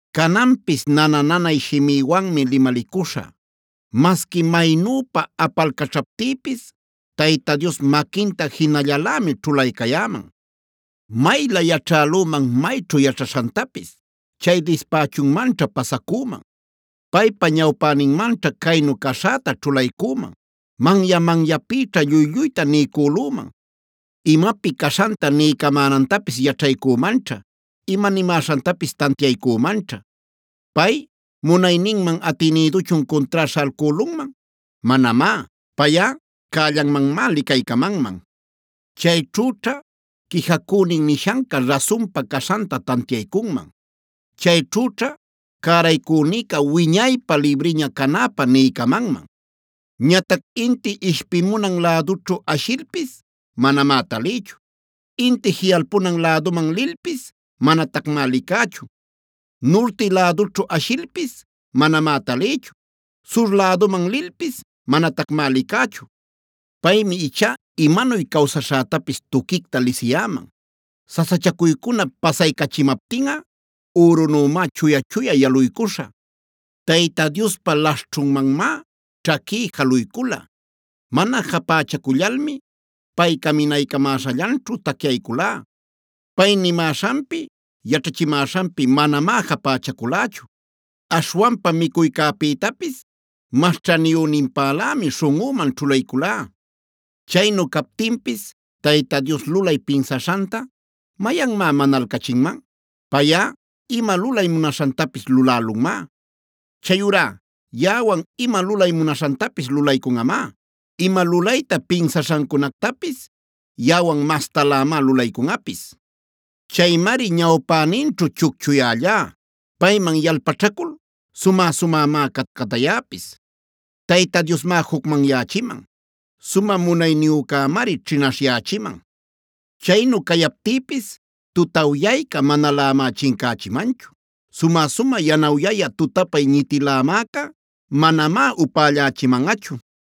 “Cananpis nana-nanay shimïwanmi limalicuśhä. Masqui maynüpa apalcaćhaptïpis Tayta Dios maquinta jinallalämi ćhulaycayäman. Maylä yaćhälüman mayćhu yaćhaśhantapis, chay dispächunmanćha pasacüman. Paypa ñawpäninmanćha caynu caśhäta ćhulaycüman; manya-manyapïćha lluy-lluyta niycülüman. Imapi caśhanta niycamänantapis yaćhaycümanćha; ima nimäśhantapis tantiaycümanćha. Pay, ¿munayninman atinïduchun cuntrá śhalcülunman? Manamá. Payꞌa cällanmanmá licaycamanman. Chayćhüćha quijacünin nishanca rasunpa caśhanta tantiaycunman. Chayćhüćha cäraycünïca wiñaypä libriña canäpä niycamanman. “Ñatac inti ishpimunan lädućhu ashilpis manamá talïchu; inti jiꞌalpunan läduman lilpis manatacmá licächu. Nurti lädućhu ashilpis manamá talïchu; sur läduman lilpis manatacmá licächu. Paymi ichá imanuy cawsaśhätapis tuquicta lisiyäman; sasachacuycunap pasaycachimaptinꞌa ürünümá chuya-chuya yaluycuśhä. Tayta Diospa laśhćhunmanmá ćhaquí jaluycula; mana japächacullalmi pay caminaycamäśhallanćhu tacyayculá. Pay nimäśhanpi, yaćhachimäśhanpi manamá japächaculächu. Aśhwanpa micuycäpïtapis mas ćhaniyüninpälämi śhunꞌüman ćhulayculá. “Chaynu captinpis Tayta Dios lulay pinsaśhanta ¿mayanmá manalcachinman? Payꞌa, ima lulay munaśhantapis lulälunmá. Chayurá yaꞌawan ima lulay munaśhantapis lulaycunꞌamá; ima lulayta pinsaśhancunactapis yaꞌawan mastalämá lulaycunꞌapis. Chaymari ñawpäninćhu chucchuyällá; payman yalpaćhacul sumä-sumämá catcatayäpis. Tayta Diosmá jucmanyächiman; sumä munayniyücämari ćhinaśhyächiman. Chaynu cayaptïpis, tutawyayca manalämá chincächimanchu. Sumä-sumä yanawyayä tutapay ñitilämäca manamá upällachimanꞌachu.